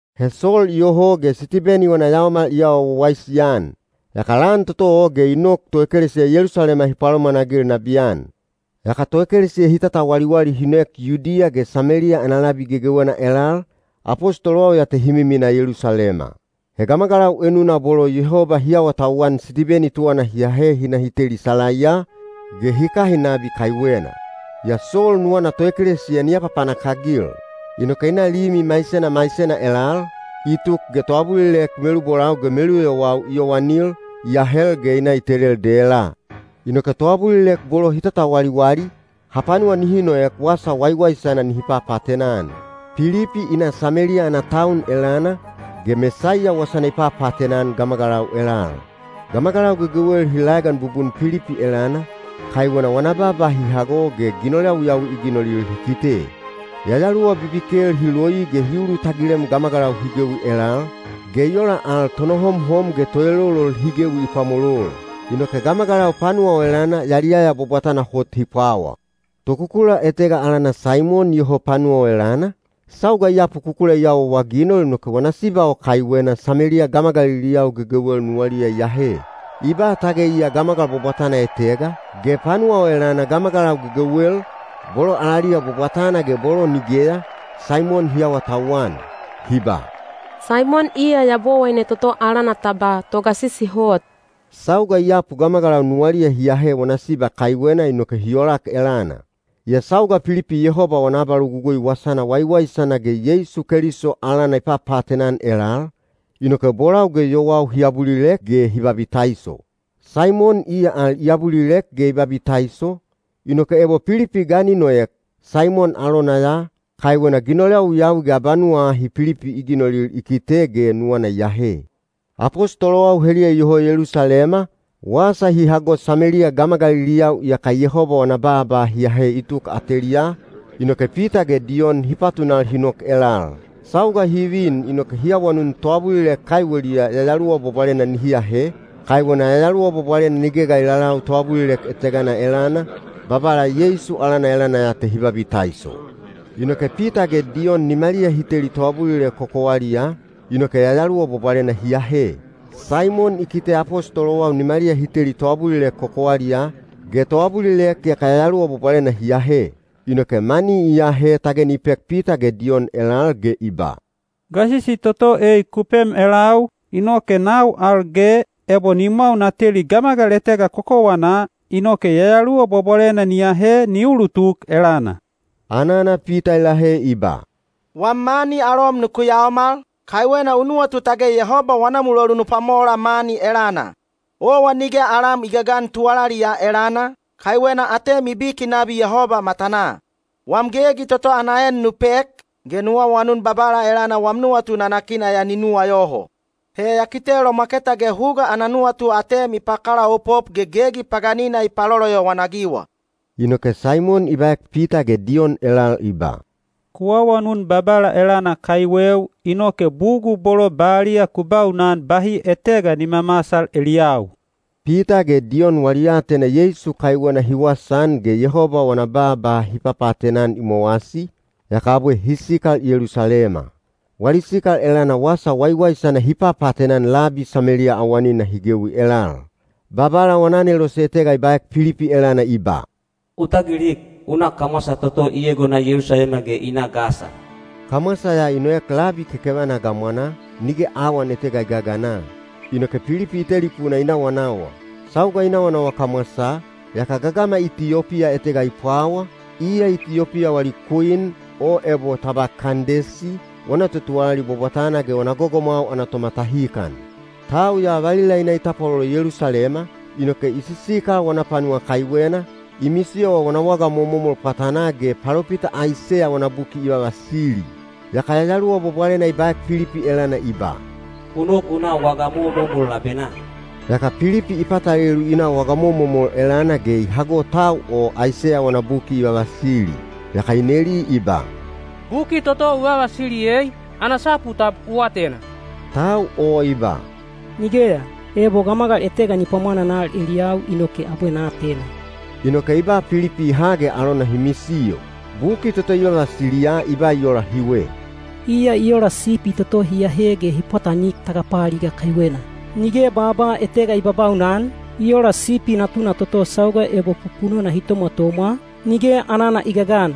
He Sol iyoho ge Sitibeni wana yaomal i awa wawaisi-an. Yaka lan toto o ge i nok toekelesiya Yelusalema hi palomwanagil nabiyan. Yaka toekelesiya hi tatawaliwali hi noek Yudiya ge Sameliya ana labi gegewena elal, apostolowau ya te hi miminaa Yelusalema. He gamagalau enuna bolo Yehoba hi awatauwan Sitibeni tuwana hi ahe hi na hi teli salaiya, ge hi kahin nabi kaiwena. Yaa Sol nuwana toekelesiya ni apapanak-agil. Inoke i na limi maisena maisena elal, i tuk ge toabulilek melubolau ge meluyowau i yowanil, i ahel ge i na i telel dela. Inoke toabulilek bolo hi tatawaliwali, hapanuwa nihi noek wasa waiwaisana nihi papaatena-an. Pilipi i na Sameliya ana taun elana, ge Mesaiya wasana i papaatena-an gamagalau elal. Gamagalau gegewel hi laegan bubun Pilipi elana, kaiwena wana baaba hi hago ge ginol yawiyawi i ginolil hi kite. Yayaluwa bibikel hi loi ge hi ulutagilem gamagalau hi gewi elal, ge i ola al tonohomhom ge toelolol hi gewi i pwamolol. Inoke gamagalau panuwa o elana yaliyaya bwabwatana hot hi pwawa. Tokukula etega alana Saimon iyoho panuwa o elana, sauga i yapu kukula i awaawaginol inoke wana siba o kaiwena Sameliya gamagaliliyau gegewel nuwaliya i ahe. I ba tage iya gamagal bwabwatana etega, ge panuwa o elana gamagalau gegewel, bolo alaliya bwabwatana ge bolo nigeya, Saimon hi awatauwan. Hi ba, “Saimon iya yabowaine toto alana ta ba ‘Togasisi Hot.’” Sauga i yapu gamagalau nuwaliya hi ahe wana siba kaiwena inoke hi olak elana. Yaa sauga Pilipi Yehoba wana abalogugui wasana waiwaisana ge Yeisu Keliso alana i papaatena-an elal, inoke bolau ge yowau hi abulilek ge hi babitaiso. Saimon iya al i abulilek ge i babitaiso, inoke ebo Pilipi ga ni noek, Saimon alona ya, kaiwena ginol yawiyawi ge abanuwa ahi Pilipi i ginolil i kite ge nuwana i ahe. Apostolowau heliya iyoho Yelusalema, wasa hi hago Sameliya gamagaliliyau iyaka Yehoba wana baaba hi ahe i tuk ateliyaa, inoke Pita ge Diyon hi patunal hi nok elal. Sauga hi vin inoke hi awanun toabulilek kaiweliya Yayaluwa Bwabwalena nihi ahe, kaiwena Yayaluwa Bwabwalena nige ga i lalau toabulilek etegana elana, Babala Yeisu alana elana ya te hi babitaiso. Inoke Pita ge Diyon nimaliya hi teli toabulilek kokowaliyaa, inoke Yayaluwa Bwabwalena hi ahe. Saimon i kite apostolowau nimaliya hi teli toabulilek kokowaliyaa, ge toabulilek yaka Yayaluwa Bwabwalena hi ahe. Inoke mani i ahe tage ni pek Pita ge Diyon elal ge i ba, “Gasisi toto ei ku pem elau, inoke nau al ge, ebo nimwau na teli gamagal etega kokowanaa, inoke Yayaluwa Bwabwalena ni ahe ni ulutuk elana.” Anana Pita i lahe i ba, “Wam mani alom nuku yaomal, kaiwena u nuwatu tage Yehoba wana mulolu nu pwamola mani elana! Owa nige alam i gagana tuwalali ya elana, kaiwena atem i biki nabi Yehoba matanaa. Wam gegi toto ya ana en nu pek, ge nu awanun Babala elana wam nuwatu nanakina ya ni nuwayoho. He ya kite lomwaketa ge huga ana nuwatu atem i pakalaopop ge gegi paganina i paloloyowan-agiwa.” Inoke Saimon i baek Pita ge Diyon elal i ba, “Ku awanun Babala elana kaiweu, inoke bugul bolo baliya ku baunan bahi etega ni mamasal eliyau.” Pita ge Diyon wali aatena Yeisu kaiwena hi wasaan ge Yehoba wana baaba hi papaatena-an i mowasi, yaka abwe hi sikal Yelusalema. Wali sikal elana wasa waiwaisana hi papaatena-an labi Sameliya awanina hi gewi elal. Babala wana anelose etega i baek Pilipi elana i ba, “U tagilik, u na kamwasa toto i egona Yelusalema ge i na Gasa.” Kamwasa ya i noek labi kekevana gamwanaa, nige awan etega i gagana. Inoke Pilipi i telipuna i nawanawa. Sauga i nawanawa kamwasaa, yaka gagama Itiyopiya etega i pwawa, iya Itiyopiya wali kwin, o ebo ta ba Kandesi, wana totuwalali bwabwatana ge wana gogomwau ana tomatahikan. Tau ya valila i na i tapwalolo Yelusalema, inoke i sisikal wana panuwa kaiwena, i misiyowa wana waga momomol pwatanaa ge palopita Aiseya wana buki i vavasili. Yaka Yayaluwa Bwabwalena i baek Pilipi elana i ba, “U nok u na waga momomol labenaa.” Yaka Pilipi i patalelu i na waga momomol elana ge i hago tau o Aiseya wana buki i vavasili. Yaka i neli i ba, “Buki toto u vavasili ei, ana sapu tab u atena?” Tau o i ba, “Nigeya! Ebo gamagal etega ni pwamwananal eliyau inoke abwe na atena.” Inoke i ba Pilipi i ha ge alona hi misiyo. Buki toto i vavasiliya i ba i ola hiwe: Iya i ola sipi toto hi ahe ge hi pwatanik tagapaaliga kaiwena. Nige baaba etega i babaunan, i ola sipi natuna toto sauga ebo pupunona hi tomwatomwa, nige anana i gagan.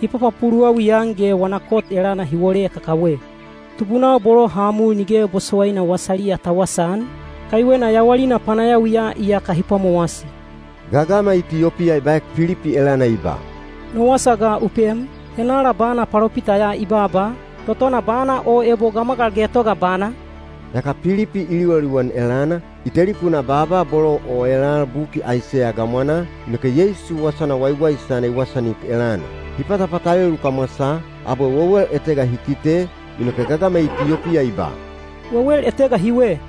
Hi papapuluwawi-an ge wana kot elana hi wole kakawe. Tubunau bolo ha mul nige bosowaina wasaliya ta wasaan, kaiwena yawalina panayawiya iyaka hi pwamowasi. Gagama Itiyopiya i baek Pilipi elana i ba, “No wasa ga u pem, henala bana palopita ya i baaba, totona bana o ebo gamagal getoga bana?” Yaka Pilipi i liwaliwan elana, i telipunaa baaba bolo o elal buki Aiseya gamwanaa, inoke Yeisu wasana waiwaisana i wasaanik elana. Hi patapatalelu kamwasaa, abwe wewel etega hi kite, inoke gagama Itiyopiya i ba, “Wewel etega hiwe.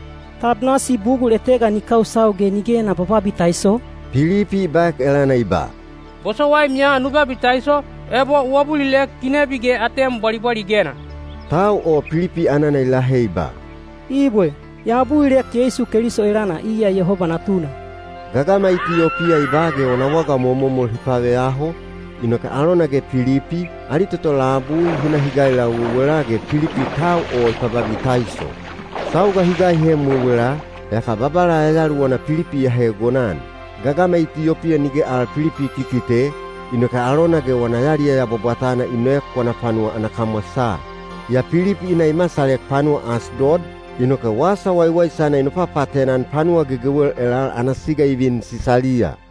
Tab nasi bugul etega ni kausau ge nige na bababitaiso?” Pilipi i baek elana i ba, “Bosowaim ya nu babitaiso, ebo u abulilek ginebi ge atem bwalibwaligena.” Tau o Pilipi anana i lahe i ba, “Ibwe, ya abulilek Yeisu Keliso elana iya Yehoba Natuna.” Gagama Itiyopiya i ba ge wana waga momomol hi paveyaho, inoke alona ge Pilipi, ali toto labui, hi na hi gailau wewela ge Pilipi tau o i pababitaiso. Sauga hi gaihem wewela, yaka Babala Yayaluwana Pilipi i ahe egonan. Gagama Itiyopiya nige al Pilipi i kikite, inoke alona ge wana yaliyaya bwabwatana i noek wana panuwa ana kamwasaa. Yaa Pilipi i na i masalek panuwa Asdod, inoke wasa waiwaisana i nopapaatena-an panuwa gegewel elal ana siga i vin Sisaliya.